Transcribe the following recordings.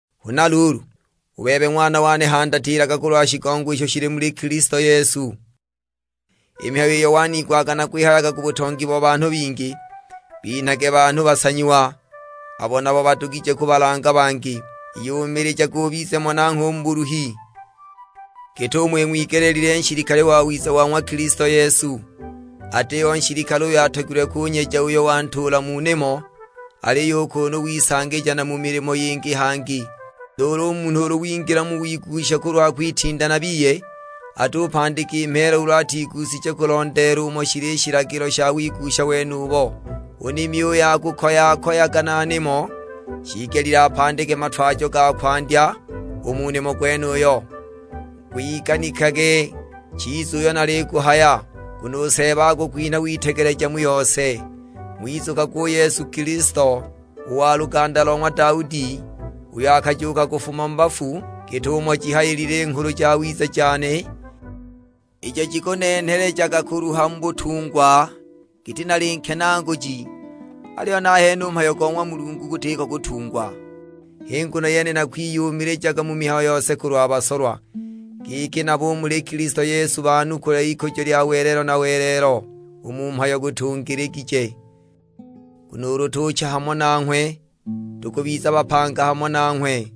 Huna luulu, u bebe ng'wana wane handatilaga kulwa shigongo isho shili muli Kilisto Yesu. I mihayo iyo waniigwaga nakwihayaga ku butongi bo banhu bingi, binhage banhu basanyiwa, abo nabo badugije kubalanga bangi. Iyumilijage ubize mo nangho u mu buluhi, git'umo ing'wigeleelilwe nshilikale wawiza wa ng'wa Kilisto Yesu. Atiho nshilikale uyo atogilwe kunyeja uyo wantuula mu nimo, aliyo u kunu wisangilija na mu milimo yingi hangi. Nuulu u munhu ulu wingila mu wigusha kulwa kwitinda na biye, atupandika i mheela ulu atigushije kulondeela umo shili i shilagilo sha wigusha wenubo. U nimi uyo akukoya-koyaga na nimo, shiigelile apandike matwajo ga kwandya u mu nimo gwenuyo. Gwiganikage chiza uyo naliguhaya, nguno u Seeba akukwinha witegeleja mu yose. Ng'wizukagwe u Yesu Kilisto, u wa luganda lo ng'wa Daudi, uyo akajuuka kufuma mu bafu; git'umo jihayilile i Nghulu Jawiza jane, ijo jikunenhelejaga kuluha mu butungwa giti nali nkenaaguji. Aliyo nahene u mhayo go ng'wa Mulungu gutiko u kutungwa. H'i nguno yene nakwiyumilijaga mu mihayo yose kulwa basolwa, giki nabo u muli Kilisto Yesu banukule ikujo lya welelo na welelo. U mhayo gutungiligije, "Nguno ulu tucha hamo nanghwe tukubiza bapanga hamo nanghwe.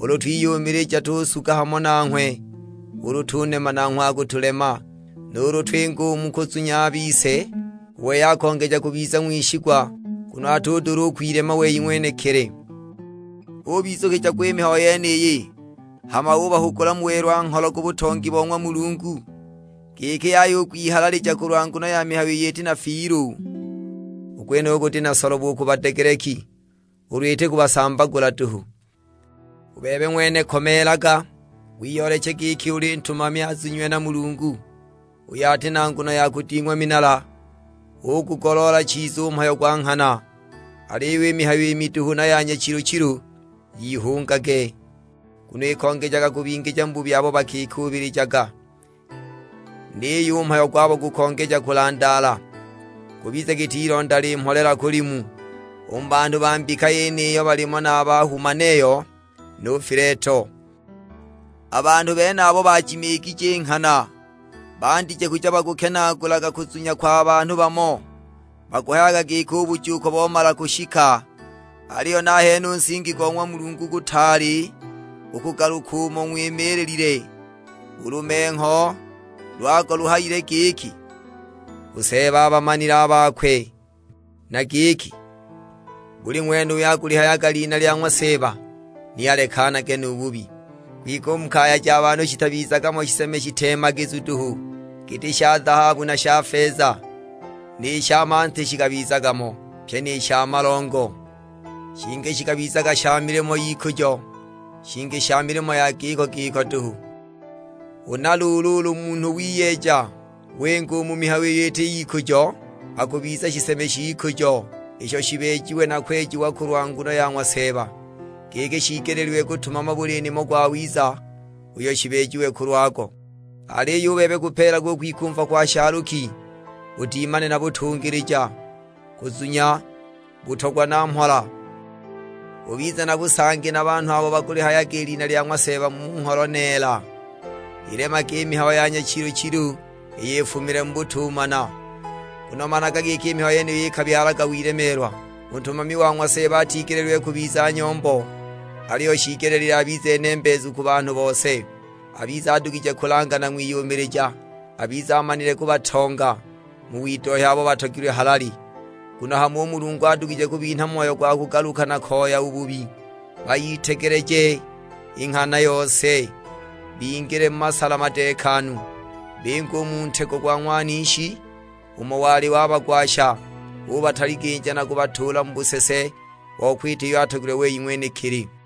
Ulu twiyumilija tukusuga hamo nanghwe; ulu tunema nanghwe akutulema. Nuulu twinga u mu kuzunya a bise, u wei akongeja kubiza ng'wishigwa, nguno atudula u kwilema wei ng'wenekili." Ubizukija gwa i mihayo yeniyi, hama ubahugula mu welwa-ngholo ku butongi bo ng'wa Mulungu, giki yaya u kwihalalija kulwa nguno ya mihayo iyo iti na fiilu. U gwenuyu guti na solobo u ku badegeleki, ulu iti kubasambagula duhu. U bebe ng'wene komeelaga, wiyooleche giki uli ntumami azunyiwe na Mulungu, uyo ati na nguno ya kuding'wa minala; ugugoloola chiza u mhayo gwa nghana. Aliyo i mihayo i miduhu na ya nyachilu-chilu, yihungage; nguno ikongejaga kubingija mu bubi abo bakikuubilijaga. Niyo u mhayo gwabo gukongeja kulandaala, gubize giti ilonda limholela-kulimu; u mu banhu ba mbika yeniyo balimo na a ba Humaneyo nu Fileto! A banhu benabo bijimiigije i nghana, bandije kuja bakukenaagulaga kuzunya kwa banhu bamo; bakuhayaga giki u bujuuko bomala kushika! Aliyo nahene u nsingi go ng'wa Mulungu gutaali u kugaluka umo gwimiililile: u lumengho lwago luhayile giki, "U Seeba abamanile a bakwe," na giki, "Buli ng'wene uyo akulihayaga lina lya ng'wa Seeba ni alekanage nu bubi." Kwike u mu kaya ja banhu shitabizaga mo shiseme shiteemagizu duhu, giti sha zahabu na sha feza, ni sha manti shikabizaga mo, pyi ni sha malongo; shingi shikabizaga sha milimo y'ikujo, shingi sha milimo ya giko-giko duhu. Huna luulu ulu munhu wiyeeja, winga u mu mihayo iyo iti y'ikujo, akubiza shiseme sh'ikujo, isho shibeejiwe na kwejiwa kulwa nguno ya ng'wa Seeba, giki shiigeleelwe kutumama buli nimo gwawiza, uyo shibeejiwe kulwago. Aliyo u bebe gupeelage u kwikumva kwa shaaluki, udimane na butungilija, kuzunya, butogwa na mhola; ubize na busangi na banhu abo bakulihayaga lina lya ng'wa Seeba mu ngholo neela. Ilemage i mihayo ya nyachilu-chilu iyo ifumile mu butumana, nguno managa giki i mihayo yeniyo ikabyalaga wilemeelwa. U ntumami wa ng'wa Seeba atigeleelilwe kubiza nyombo, aliyo shiigelile abize nembeezu ku banhu bose, abize adugije kulanga na ng'wiyumilija. Abize amanile kubatonga mu widohya abo batogilwe halali, nguno hamo u Mulungu adugije kubinha moyo gwa kugaluka na koya u bubi, bayitegeleje i nghana yose, bingile mu masala madeekanu. Binge u mu ntego go ng'wanishi umo wali wabagwasha ubataliginja na kubatuula mu busese bo kwita iyo atogilwe wei ng'wenekili!